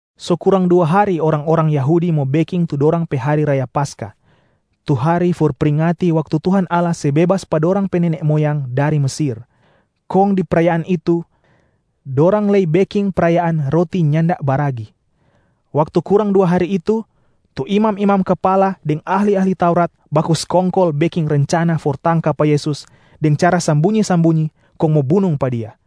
So kurang dua hari orang-orang Yahudi mo beking tu dorang pe hari raya Paskah tu hari for pringati waktu Tuhan Allah se bebas pa dorang pe nene moyang dari Mesir, kong di prayaan itu dorang lei beking prayaan Roti Nyanda Baragi. Waktu kurang dua hari itu, tu imam-imam kapala deng ahli-ahli Taurat baku skongkol beking rencana for tangka pa Yesus deng cara sambunyi-sambunyi kong mo bunung pa Dia.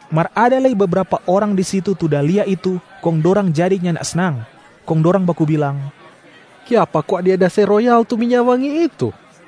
Mar ada lei bebrapa orang di situ tu da lia itu kong dorang jadi nyanda snang, kong dorang baku bilang, “Kiapa kwa dia da se royal tu minya wangi itu?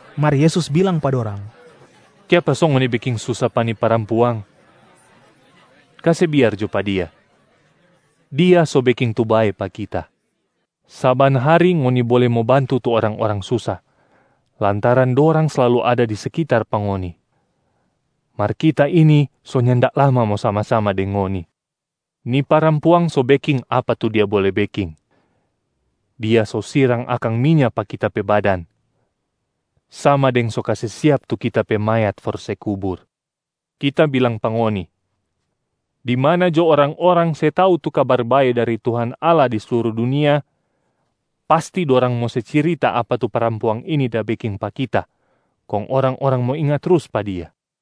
Mar Yesus bilang pa dorang, “Kiapa so ngoni beking susa pa ni parampuang? Kase biar jo pa dia. Dia so beking tu bae pa Kita. Saban hari ngoni bole mo bantu tu orang-orang susa, lantaran dorang slalu ada di sekitar pa ngoni. Mar Kita ini so nyanda lama mo sama-sama deng ngoni. Ni parampuang so beking apa tu dia bole beking. Dia so sirang akang minya pa Kita pe badan, sama deng so kase siap tu Kita pe mayat for se kubur. Kita bilang pa ngoni, di mana jo orang-orang se tau tu Kabar Bae dari Tuhan Allah di sluru dunia, pasti dorang mo se cirita apa tu parampuang ini da beking pa Kita kong orang-orang mo inga trus pa dia.”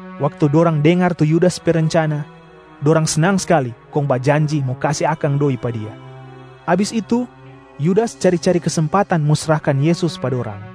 Waktu dorang dengar tu Yudas pe rencana, dorang snang skali kong bajanji mo kase akang doi pa dia. Abis itu Yudas cari-cari kesempatan mo srahkan Yesus pa dorang.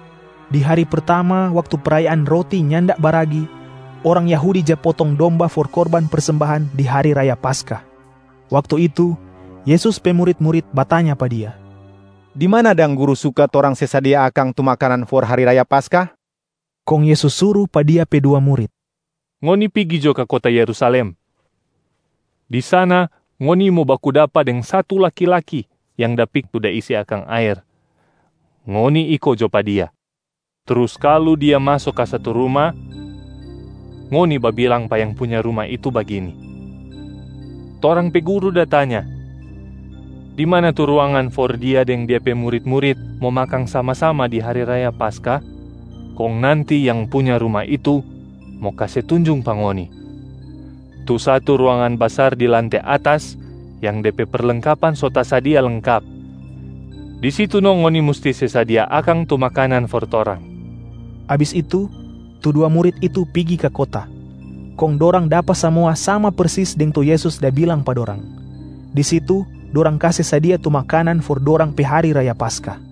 Di hari pertama waktu prayaan Roti Nyanda Baragi, orang Yahudi ja potong domba for korban persembahan di hari raya Paskah. Waktu itu, Yesus pe murit-murit batanya pa Dia, “Di mana dang Guru suka torang se sadia akang tu makanan for hari raya Paskah?” Kong Yesus suru pa Dia pe dua murit, “Ngoni pigi jo ka kota Yerusalem, di sana ngoni mo baku dapa deng satu laki-laki yang da pikul tampayang tu da isi akang aer. Ngoni iko jo pa dia, trus kalu dia maso ka satu ruma, ngoni babilang pa yang punya ruma itu bagini, ‘Torang pe Guru da tanya, di mana tu ruangan for Dia deng Dia pe murit-murit mo makang sama-sama di hari raya Paskah?’ Kong nanti yang punya ruma itu mo kase tunjung pa ngoni tu satu ruangan basar di lante atas yang de pe perlengkapan so tasadia lengkap. Di situ no ngoni musti se sadia akang tu makanan for torang!” Abis itu, tu dua murit itu pigi ka kota, kong dorang dapa samua sama persis deng tu Yesus da bilang pa dorang. Di situ dorang kase sadia tu makanan for dorang pe hari raya Paskah.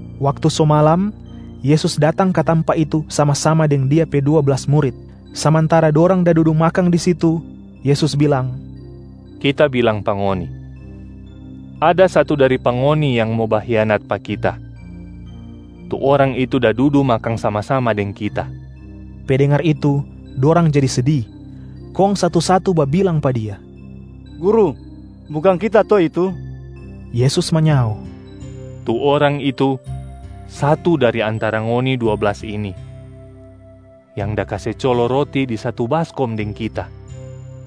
Waktu so malam, Yesus datang ka tampa itu sama-sama deng Dia pe dua blas murit. Samantara dorang da dudu makang di situ, Yesus bilang, “Kita bilang pa ngoni, ada satu dari pa ngoni yang mo bahianat pa Kita. Tu orang itu da dudu makang sama-sama deng Kita.” Pe dengar itu, dorang jadi sedi, kong satu-satu babilang pa Dia, “Guru, bukang kita to itu?” Yesus manyao, “Tu orang itu, satu dari antara ngoni dua blas ini, yang da kase colo roti di satu baskom deng Kita.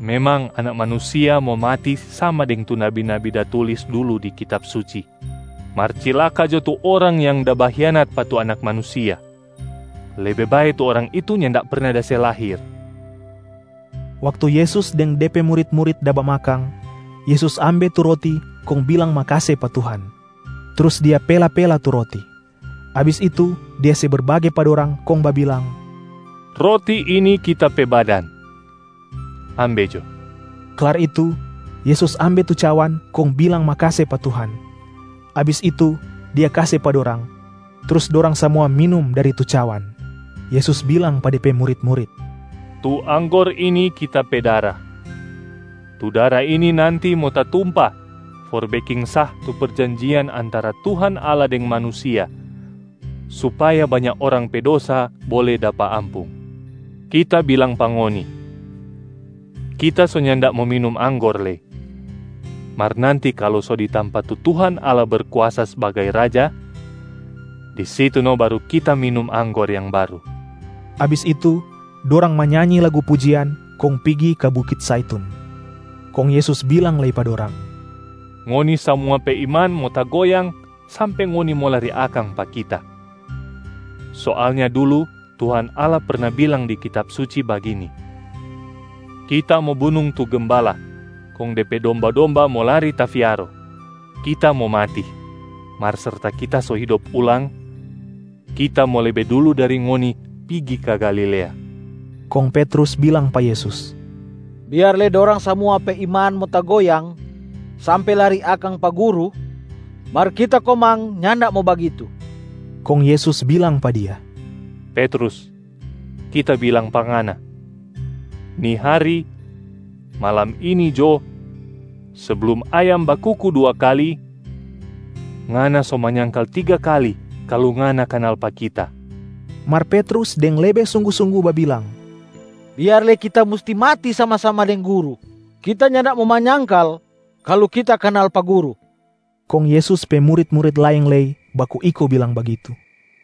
Memang Anak Manusia mo mati sama deng tu nabi-nabi da tulis dulu di Kitab Suci. Mar cilaka jo tu orang yang da bahianat pa tu Anak Manusia. Lebe bae tu orang itu nyanda perna da se lahir.” Waktu Yesus deng De pe murit-murit da bamakang, Yesus ambe tu roti kong bilang makase pa Tuhan, trus Dia pela-pela tu roti. Abis itu Dia se berbage pa dorang kong babilang, “Roti ini Kita pe badan, ambe jo.” Klar itu Yesus ambe tu cawan kong bilang makase pa Tuhan. Abis itu Dia kase pa dorang, trus dorang samua minum dari tu cawan. Yesus bilang pa De pe murit-murit, “Tu anggor ini Kita pe dara. Tu dara ini nanti mo tatumpa for beking sah tu perjanjian antara Tuhan Allah deng manusia supaya banya orang pe dosa bole dapa ampung. Kita bilang pa ngoni, Kita so nyanda mo minum anggor lei, mar nanti kalu so di tampa tu Tuhan Allah Berkuasa sbagai Raja, di situ no baru Kita minum anggor yang baru.” Abis itu, dorang manyanyi lagu pujian kong pigi ka bukit Zaitun. Kong Yesus bilang lei pa dorang, “Ngoni samua pe iman mo tagoyang sampe ngoni mo lari akang pa Kita. Soalnya dulu Tuhan Allah perna bilang di Kitab Suci bagini, ‘Kita mo bunung tu gembala, kong de pe domba-domba mo lari tafiaro.’ Kita mo mati, mar serta Kita so hidop ulang, Kita mo lebe dulu dari ngoni pigi ka Galilea.” Kong Petrus bilang pa Yesus, “Biar lei dorang samua pe iman mo tagoyang sampe lari akang pa Guru, mar kita komang nyanda mo bagitu.” Kong Yesus bilang pa dia, “Petrus, Kita bilang pa ngana. Ni hari, malam ini jo, seblum ayam bakuku dua kali, ngana so manyangkal tiga kali kalu ngana kanal pa Kita.” Mar Petrus deng lebe sunggu-sunggu babilang, “Biar lei kita musti mati sama-sama deng Guru, kita nyanda mo manyangkal kalu kita kanal pa Guru.” Kong Yesus pe murit-murit laeng lei baku iko bilang bagitu.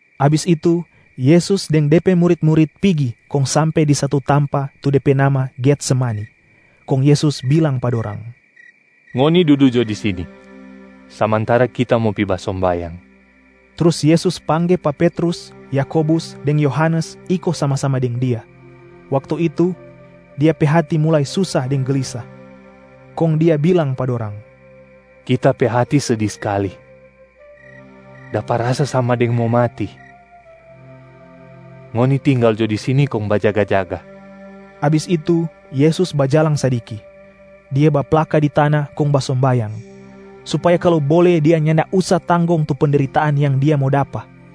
Abis itu Yesus deng De pe murit-murit pigi kong sampe di satu tampa tu de pe nama Getsemani. Kong Yesus bilang pa dorang, “Ngoni dudu jo di sini, samantara Kita mo pi basombayang.” Trus Yesus pangge pa Petrus, Yakobus deng Yohanes iko sama-sama deng Dia. Waktu itu, Dia pe hati mulai susa deng gelisa. Kong Dia bilang pa dorang, “Kita pe hati sedi skali, dapa rasa sama deng mo mati. Ngoni tinggal jo di sini kong bajaga-jaga.” Abis itu Yesus bajalang sadiki. Dia baplaka di tana kong basombayang, supaya kalu bole Dia nyanda usa tanggong tu pendritaan yang Dia mo dapa.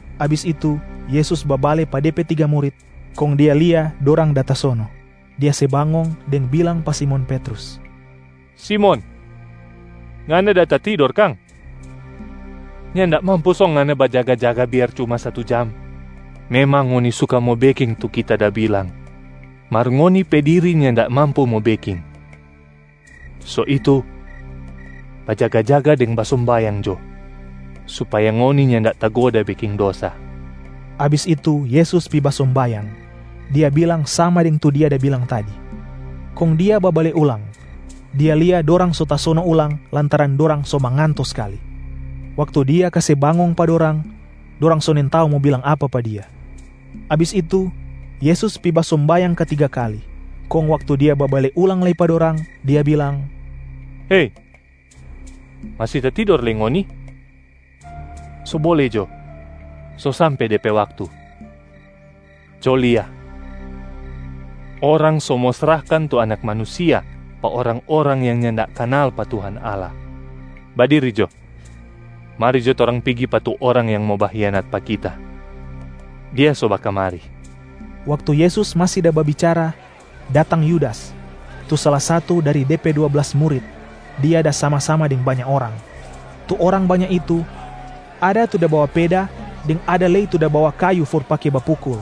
Abis itu Yesus babale pa De pe tiga murit, kong Dia lia dorang da tasono. Dia se bangong deng bilang pa Simon Petrus, “Simon, ngana da tatidor kang? Nyanda mampu so ngana bajaga-jaga biar cuma satu jam? Memang ngoni suka mo beking tu Kita da bilang, mar ngoni pe diri nyanda mampu mo beking. So itu, bajaga-jaga deng basombayang jo supaya ngoni nyanda tagoda beking dosa.” Abis itu Yesus pi basombayang, Dia bilang sama deng tu Dia da bilang tadi. Kong Dia babale ulang, Dia lia dorang so tasono ulang lantaran dorang so manganto skali. Waktu Dia kase bangong pa dorang, dorang so nintau mo bilang apa pa Dia. Abis itu Yesus pi basombayang katiga kali, kong waktu Dia babale ulang lei pa dorang, Dia bilang, “Hei! Masi tatidor lei ngoni? So bole jo, so sampe de pe waktu. Co lia, orang so mo srahkan tu Anak Manusia pa orang-orang yang nyanda kanal pa Tuhan Allah. Badiri jo! Mari jo torang pigi pa tu orang yang mo bahianat pa Kita, dia so bakamari.” Waktu Yesus masi da babicara, datang Yudas, tu sala satu dari De pe dua blas murit, dia da sama-sama deng banya orang. Tu orang banya itu, ada tu da bawa peda deng ada lei tu da bawa kayu for pake bapukul.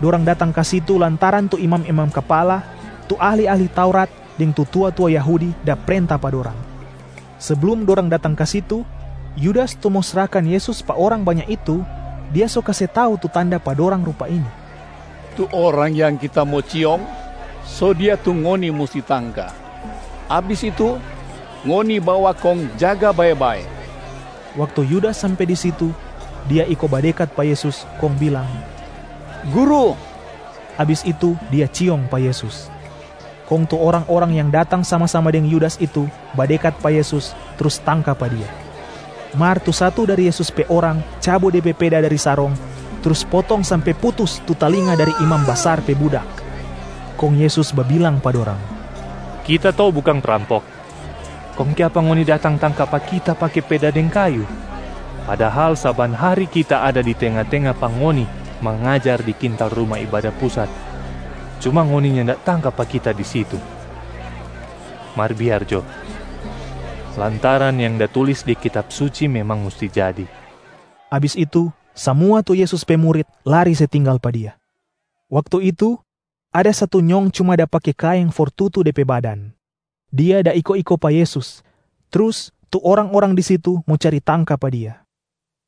Dorang datang ka situ lantaran tu imam-imam kapala, tu ahli-ahli Taurat deng tu tua-tua Yahudi da prenta pa dorang. Seblum dorang datang ka situ, Yudas tu mo srahkan Yesus pa orang banya itu, dia so kase tau tu tanda pa dorang rupa ini, “Tu orang yang kita mo ciong, so Dia tu ngoni musti tangka. Abis itu, ngoni bawa kong jaga bae-bae.” Waktu Yudas sampe di situ, dia iko badekat pa Yesus kong bilang, “Guru!” Abis itu dia ciong pa Yesus. Kong tu orang-orang yang datang sama-sama deng Yudas itu badekat pa Yesus trus tangka pa Dia. Mar tu satu dari Yesus pe orang cabu de pe peda dari sarong trus potong sampe putus tu talinga dari imam basar pe budak. Kong Yesus babilang pa dorang, “Kita to bukang prampok, kong kiapa ngoni datang tangka pa Kita pake peda deng kayu? Padahal saban hari Kita ada di tenga-tenga pa ngoni mangajar di kintal Ruma Ibada Pusat, cuma ngoni nyanda tangka pa Kita di situ. Mar biar jo, lantaran yang da tulis di Kitab Suci memang musti jadi.” Abis itu samua tu Yesus pe murit lari se tinggal pa Dia. Waktu itu, ada satu nyong cuma da pake kaeng for tutu de pe badan. Dia da iko-iko pa Yesus. Trus tu orang-orang di situ mo cari tangka pa dia,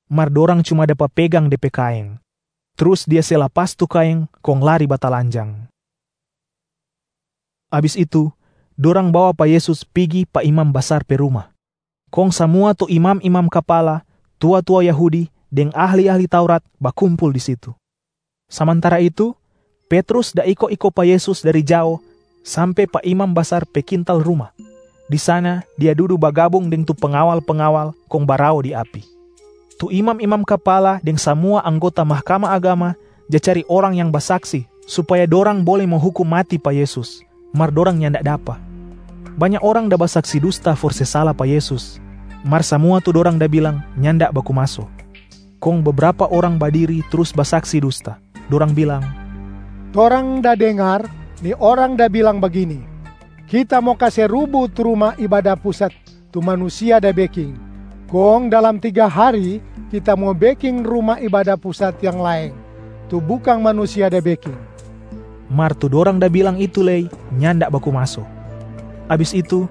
mar dorang cuma dapa pegang de pe kaeng, trus dia se lapas tu kaeng kong lari batalanjang. Abis itu, dorang bawa pa Yesus pigi pa imam basar pe ruma. Kong samua tu imam-imam kapala, tua-tua Yahudi deng ahli-ahli Taurat bakumpul di situ. Samantara itu, Petrus da iko-iko pa Yesus dari jao sampe pa imam basar pe kintal ruma. Di sana dia dudu bagabung deng tu pengawal-pengawal kong barao di api. Tu imam-imam kapala deng samua anggota Mahkamah Agama ja cari orang yang basaksi supaya dorang bole mo hukum mati pa Yesus, mar dorang nyanda dapa. Banya orang da basaksi dusta for se sala pa Yesus, mar samua tu dorang da bilang nyanda baku maso. Kong bebrapa orang badiri trus basaksi dusta, dorang bilang, “Torang da dengar ni Orang da bilang bagini, ‘Kita mo kase rubu tu Ruma Ibada Pusat tu manusia da beking, kong dalam tiga hari Kita mo beking Ruma Ibada Pusat yang laeng, tu bukang manusia da beking.’” Mar tu dorang da bilang itu lei nyanda baku maso. Abis itu,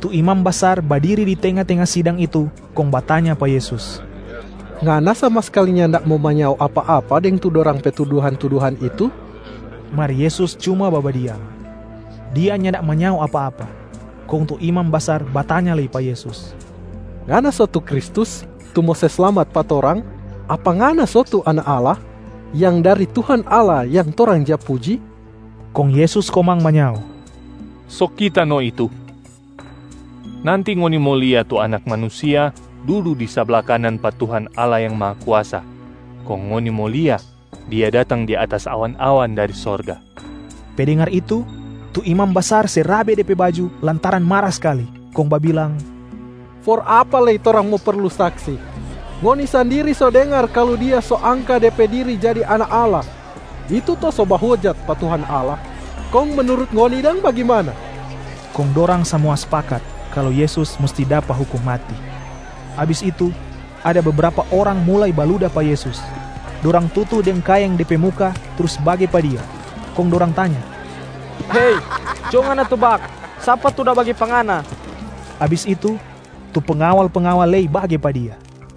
tu imam basar badiri di tenga-tenga sidang itu kong batanya pa Yesus, “Ngana sama skali nyanda mo manyao apa-apa deng tu dorang pe tuduhan-tuduhan itu?” Mar Yesus cuma babadiam, Dia nyanda manyao apa-apa. Kong tu imam basar batanya lei pa Yesus, “Ngana so tu Kristus tu mo se slamat pa torang? Apa Ngana so tu Anak Allah, yang dari Tuhan Allah yang torang ja puji?” Kong Yesus komang manyao, “So Kita no itu. Nanti ngoni mo lia tu Anak Manusia dudu di sabla kanan pa Tuhan Allah Yang Mahakuasa, kong ngoni mo lia Dia datang di atas awan-awan dari sorga.” Pe dengar itu, tu imam basar se rabe de pe baju lantaran mara skali, kong babilang, “For apa lei torang mo perlu saksi? Ngoni sandiri so dengar kalu Dia so angka De pe diri jadi Anak Allah, itu to so bahojat pa Tuhan Allah. Kong menurut ngoni dang bagimana?” Kong dorang samua spakat kalu Yesus musti dapa hukum mati. Abis itu, ada bebrapa orang mulai baluda pa Yesus. Dorang tutu deng kaeng De pe muka trus bage pa Dia, kong dorang tanya, “Hei! Co Ngana tebak, sapa tu da bage pa Ngana?” Abis itu, tu pengawal-pengawal lei bage pa Dia.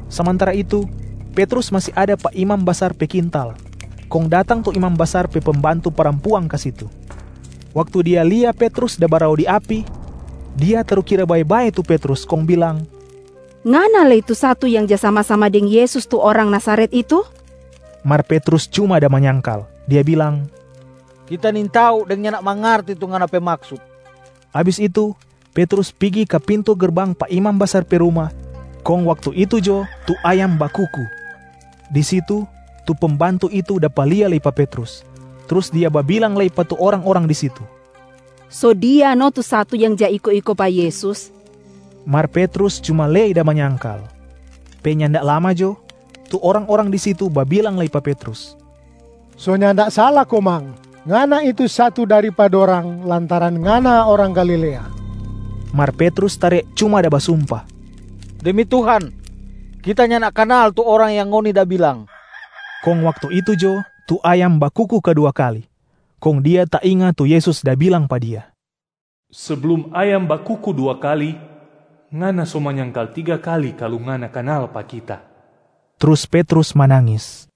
Samantara itu, Petrus masi ada pa imam basar pe kintal, kong datang tu imam basar pe pembantu parampuang ka situ. Waktu dia lia Petrus da barao di api, dia tarukira bae-bae tu Petrus kong bilang, “Ngana lei tu satu yang ja sama-sama deng Yesus tu orang Nazaret itu?” Mar Petrus cuma da manyangkal, dia bilang, “Kita nintau deng nyanda mangarti tu ngana pe maksut.” Abis itu Petrus pigi ka pintu gerbang pa imam basar pe ruma, kong waktu itu jo tu ayam bakuku. Di situ, tu pembantu itu dapa lia lei pa Petrus, trus dia babilang lei pa tu orang-orang di situ, “So dia no tu satu yang ja iko-iko pa Yesus.” Mar Petrus cuma lei da manyangkal. Pe nyanda lama jo, tu orang-orang di situ babilang lei pa Petrus, “So nyanda sala komang, ngana itu satu dari pa dorang lantaran ngana orang Galilea!” Mar Petrus tare cuma da basumpa, “Demi Tuhan, kita nyanda kanal tu orang yang ngoni da bilang!” Kong waktu itu jo tu ayam bakuku kadua kali. Kong dia tainga tu Yesus da bilang pa dia, “Seblum ayam bakuku dua kali, ngana so manyangkal tiga kali kalu ngana kanal pa Kita.” Trus Petrus manangis.